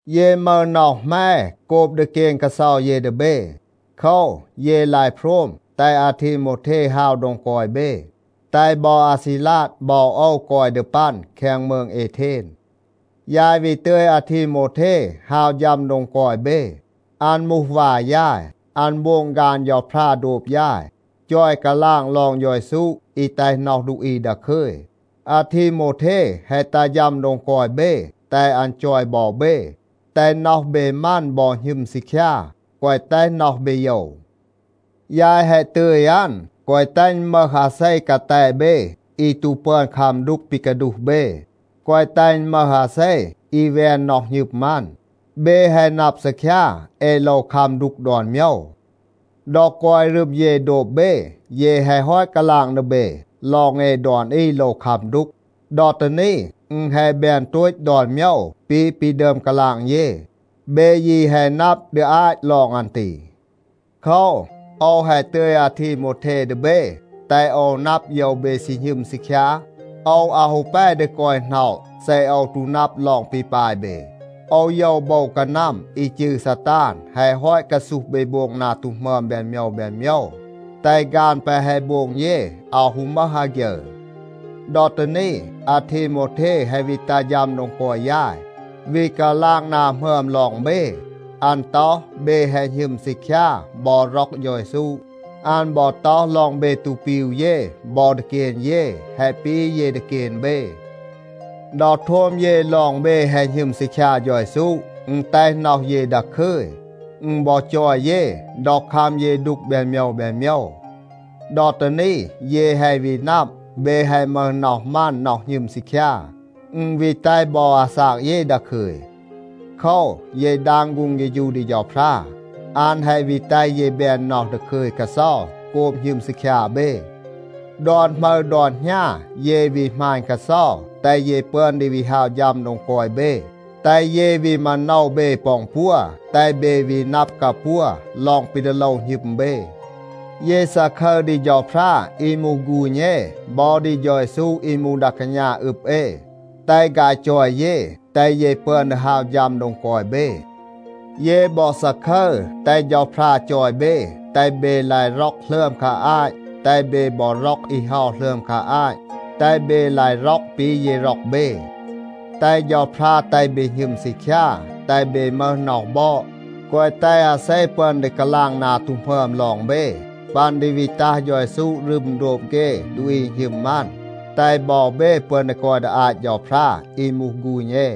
เย มึห น็อห แหม โกบ ดีเกน กาเซา เย ดี เบ. โคว, เย ลาย โพรม แตห อาทีโมวเท ฮาว โดง กอย เบ, แตห บอ อาซีลาด บอ โอว กอย ดี ปัน แคง มืง เอเทน. ยาย วี ตึย อาทีโมวเท ฮาว ฌัม โดง กอย เบ. อัน มูห วา ยาย. อัน โบง ฆาน เฌาพรา โดบ ยาย, จอย กาลาง ลอง เฌา เยซู อี แตห น็อห ดูอี ดาคึย. อาทีโมวเท แฮะ ตัห ฌัม โดง กอย เบ, แตห อัน จอย บอ เบ, แตห น็อห เบ มัน บอ หณึม ซีคยา, แกวะ แตห น็อห เบ โยว. ยาย แฮะ ตึย อัน, แกวะ แตห อึณ มึห อาเซ กาแต เบ อี ตู ปึอน คัม ดูก ปี กาดูห เบ. แกวะ แตห อึณ มึห อาเซ, อี แวน น็อห หณึม อัน. เบ แฮะ นับ ซีคยา, เอ โลว คัม ดูก ดอน โมยว. ดอ กอย รึม เย โดบ เบ, เย แฮะ ฮอต กาลาง ดี เบ ลอง เอ ดอน อี โลว คัม ดูก. ดอ ตี นี, อึณ แฮะ แบน โตต ดอน โมยว ปี ปี ดึอม กาลาง เย. เบ ยี แฮะ นับ ดี อาต ลอง อัน ตี. โคว, โอว แฮะ ตึย อาทีโมวเท ดี เบ, แตห โอว นับ โยว เบ ซี หณึม ซีคยา. โอว อาว ฮู แป ดี กอย หน็อะ เซ โอว ตู นับ ลอง ปี ปาย เบ. โอว โยว โบว กานัม อี จืร ซาตาน แฮะ ฮอต กาซูห เบ โบง นา ตู หมึอม แบน โมยว แบน โมยว, แตห ฆาน แปะ แฮะ โบง เย อาว ฮู มึห อาฆยึร. ดอ ตี นี, อาทีโมวเท แฮะ วี ตัห ฌัม โดง กอย ยาย, วี กาลาง นา หมึอม ลอง เบ. อัน ต็อห, เบ แฮะ หณึม ซีคยา บอ ร็อก เฌา เยซู. อัน บอ ต็อห ลอง เบ ตู ปีว เย บอ ดีเกน เย, แฮะ ปี เย ดีเกน เบ. ดอ โทม เย ลอง เบ แฮะ หณึม ซีคยา เฌา เยซู, อึณ แตห น็อห เย ดาคึย. อึณ บอ จอย เย, ดอ คัม เย ดูก แบน โมยว แบน โมยว. ดอ ตี นี เย แฮะ วี นับ, เบ แฮะ มึห น็อห มัน น็อห หณึม ซีคยา. อึณ วี แตห บอ อาซาก เย ดาคึย. โคว, เย ดาง ฆูง เฆฌู ดี เฌาพรา. อัน แฮะ วี แตห เย แบน น็อห ดาคึย กาเซา โกบ หณึม ซีคยา เบ. ดอน หมึร ดอน หณา เย วี หมาณ กาเซา, แตห เย ปึอน ดี วี ฮาว ฌัม โดง กอย เบ, แตห เย วี มาโนว เบ ปอ อึณปัว, แตห เบ วี นับ กาปัว ลอง ปี ดี โลว หณึม เบ. เย ซาคึร ดี เฌาพรา อี มูห ฆูณ เอ, บอ ดี เฌา เยซู อี มูห ดา กาณา อึบ เอ, แตห ฆาย จอย เย, แตห เย ปึอน ดี ฮาว ฌัม โดง กอย เบ. เย บอ ซาคึร, แตห เฌาพรา จอย เบ, แตห เบ ลาย ร็อก หลึอม คา อาต แตห เบ บอ ร็อก อี เฮา หลึอม คา อาต แตห เบ ลาย ร็อก ปี เย ร็อก เบ. แตห เฌาพรา แตห เบ หณึม ซีคยา, แตห เบ มึห น็อห บอด, แกวะ แตห อาเซ ปึอน ดี กาลาง นา ตู หมึอม ลอง เบ. ปัน ดี วี ตัห เฌา เยซู รึม โดบ เฆ ดูอี อี หณึม อัน, แตห บอ เบ ปึอน ดี กอย ดี อาต เฌาพรา, อี มูห ฆูณ เอ.